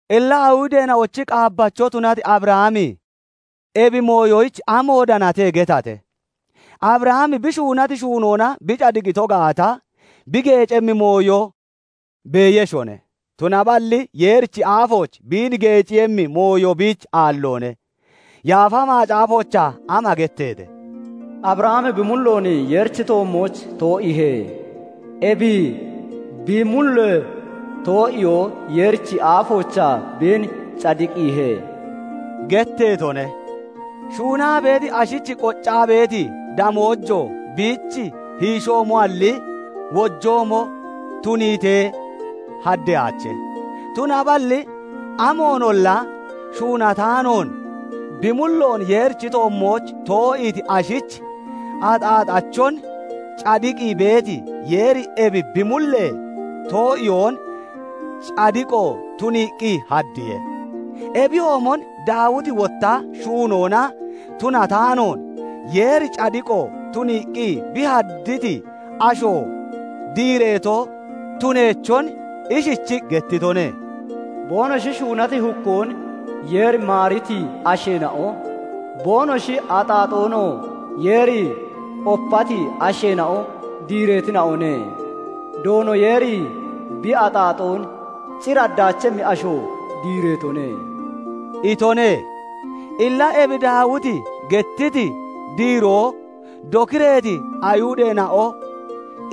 Illa Ayihudeena'ochi qaabbacho tunati Abrahami ebi mooyoyich amoon danate getate? Abrahami bi shuunati shuunoona bi cadiqito gaata, bi geecemmi mooyo beeyeshone; tunaballi Yeerichi aafooch biin geeciiyemmi mooyo biich aalloone. Yaafa Macaafoochaa ama getteete? "Abrahami bi mulloon Yeerichi toommooch too'iihe; ebi bi mullee too'iyoo Yeerichi aafoochaa biin cadiqiihe" getteetone. Shuunaa beeti ashich qoccaa beeti damoojo biich hiishoomoalli, wojoomo tuniitee haddeyaache. Tunaballi amoonolla shuunataanoon, bi mulloon Yeerichi toommooch too'iiti ashich axaaxachon cadiqii beeti Yeeri ebi bi mullee too'iyoon cadiqo tuniiqqi haddiye. Ebiyoomon Daawiti wotta shuunoona tunataanoon, Yeeri cadiqo tuniiqqi bi hadditi asho diireeto tuneechon ishichii gettitone:- "Boonoshi shuunati hukkoon Yeeri maariti asheena'o, boonoshi axaaxoonoo Yeeri opati asheena'o diireetina'one; Doono Yeeri bi axaaxoon cir haddaachemmi asho diireetone" itone. Illa ebi Daawiti gettiti diiroo dokireeti Ayihudeena'o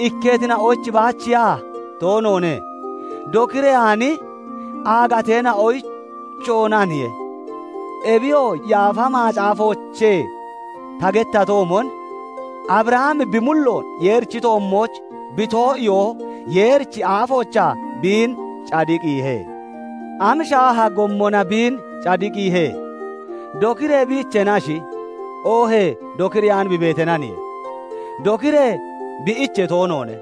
ikketina'oyich baachiya? Toonoone. Dokireyaani aagateena'oyichoonaniye. Ebiyoo Yaafa Macaafoochee ta gettatoomon, "Abrahami bi mulloon Yeerichi toommooch bi too'iyoo Yeerichi aafoochaa biin cadiqiihe." Am shaaha gommona biin cadiqiihe? Dokiree bi iicheenashi, oohee dokireyaan bi beeteenaniye? Dokiree bi iichee toonoone;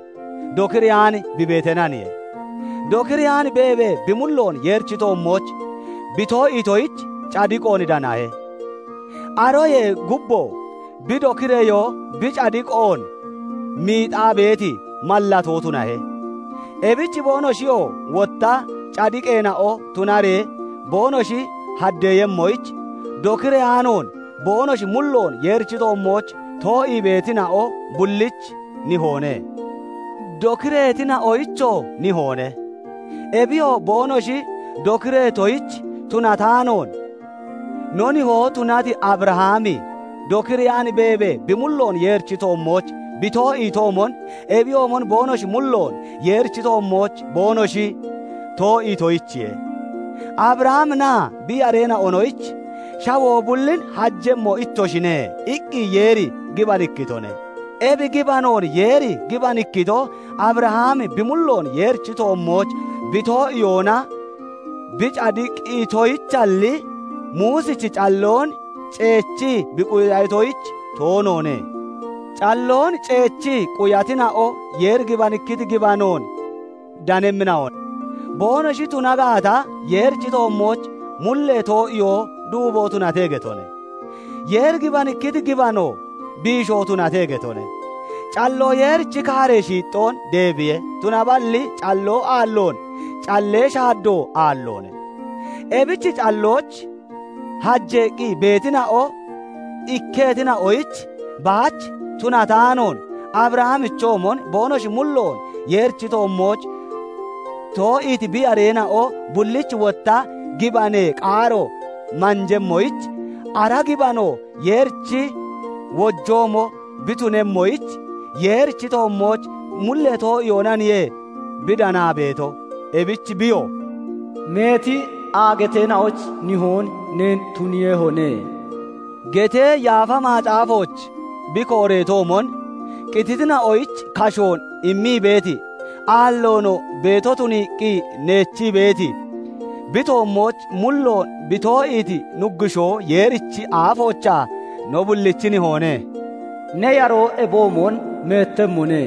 dokireyaan bi beeteenaniye. Dokireyaan beebee, bi mulloon Yeerichi toommooch bi too'iitoyich cadiqoon danahe. Aroyee gubboo bi dokireyoo bi cadiqoon miixaa beeti mallatoo tunahe. Ebich boonoshiyoo wotta cadiqeena'o tunaree boonoshi haddeemmoyich, dokireyaanoon, boonoshi mulloon Yeerichi toommooch too'ii beetina'o bullich nihoone. Dokireetina'oyichoo nihoone. Ebiyoo boonoshi dokireetoyich tunataanoon, no nihoo tunati Abrahami dokireyaan beebee, bi mulloon Yeerichi toommooch bi too'iitoomon, ebiyoomon boonoshi mulloon Yeerichi toommooch boonoshi too'iitoyichiye. Abrahaminaa bi yareena'onoyich "Shawoo bullin hajemmo ittoshine" iqqi Yeeri gibanikkitone. Ebi gibanoon Yeeri gibanikkito, Abrahami bi mulloon Yeerichi toommooch bi too'iyoona bi cadiqitoyichalli, Muusichi calloon ceechii bi quyatoyich toonoone. Calloon ceechii quyatina'o Yeeri gibanikkiti gibanoon danemmina'o boonoshi tuna gaata, Yeerichi toommooch mullee too'iyoo duubo tunate getone; Yeeri gibanikkiti gibanoo biisho tunate getone. Calloo Yeerichi kaaree shiixxoon deebiye; tunaballi calloo aalloon callee shaaddo aalloone. Ebich calloyich hajeeqqi beetina'o ikketina'oyich baach tunataanoon, Abrahamichoomon boonoshi mulloon Yeerichi toommooch too'iiti bi yareena'o bullich wotta gibanee qaaro manjemmoyich, ara gibanoo Yeerichi wojoomo bi tunemmoyich, Yeerichi toommooch mullee too'iyoonaniye bi danaa beeto. Ebich biyoo "Meeti aagateena'oyich nihoon neen tuniihoye" getee Yaafa Macaafooch bi kooreetoomon, qititina'oyich kashoon immii beeti, aalloonoo beeto tuniiqqi neechii beeti, bi toommooch mulloon bi too'iiti Nuggushoo Yeerichi aafoochaa no bullichi nihoone. "Ne yaroo ebiyoomon meettemmone"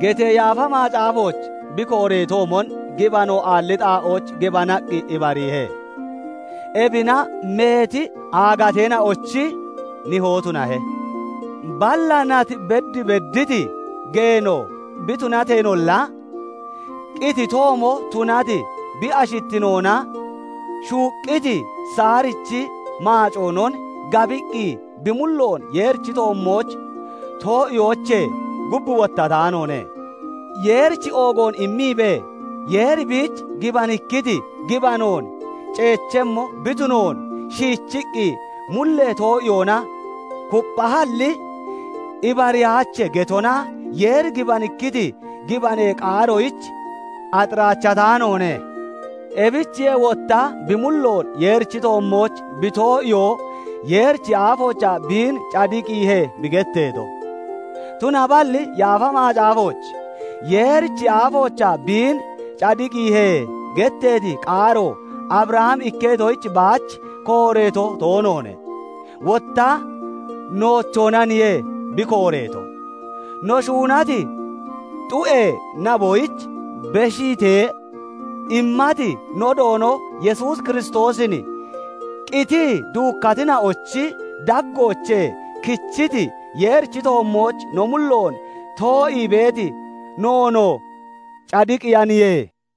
getee Yaafa Macaafooch bi kooreetoomon, gibano aalli xaa'ooch gibanaqqi ibariihe; ebina meeti aagateena'ochi nihoo tunahe. Balla nat bed bedditi geeno bi tunateenolla, qititoomo tunati bi ashittinoonaa shuuqqiti Saarichi maacoonon gabiqqi bi mulloon Yeerichi toommooch too'iyoochee gub wottataanoone. Yeerich oogoon immiibee, Yeeri biich gibanikkiti gibanoon ceechemmo bi tunoon xiishiqqi mullee too'iyoona kupphahalli, "Ibariyaache" getona Yeeri gibanikkiti gibanee qaaroyich axiraachataanoone. Ebichiye [wotta] "Bi mulloon Yeerichi toommooch bi too'iyoo Yeerichi aafoochaa biin cadiqiihe" bi getteeto. Tunaballi Yaafa Macaafooch "Yeerichi aafoochaa biin cadiqiihe" getteeti qaaro Abrahami ikketoyich baach kooreeto toonoone; wotta noochoonaniye bi kooreeto. No shuunati xu'ee naboyich beshiitee immati no Doono Yesuus Kiristoosin qitii duukkatina'ochi daggoochee kichiti Yeerichi toommooch no mulloon too'ii beeti noonoo cadiqiiyaniye.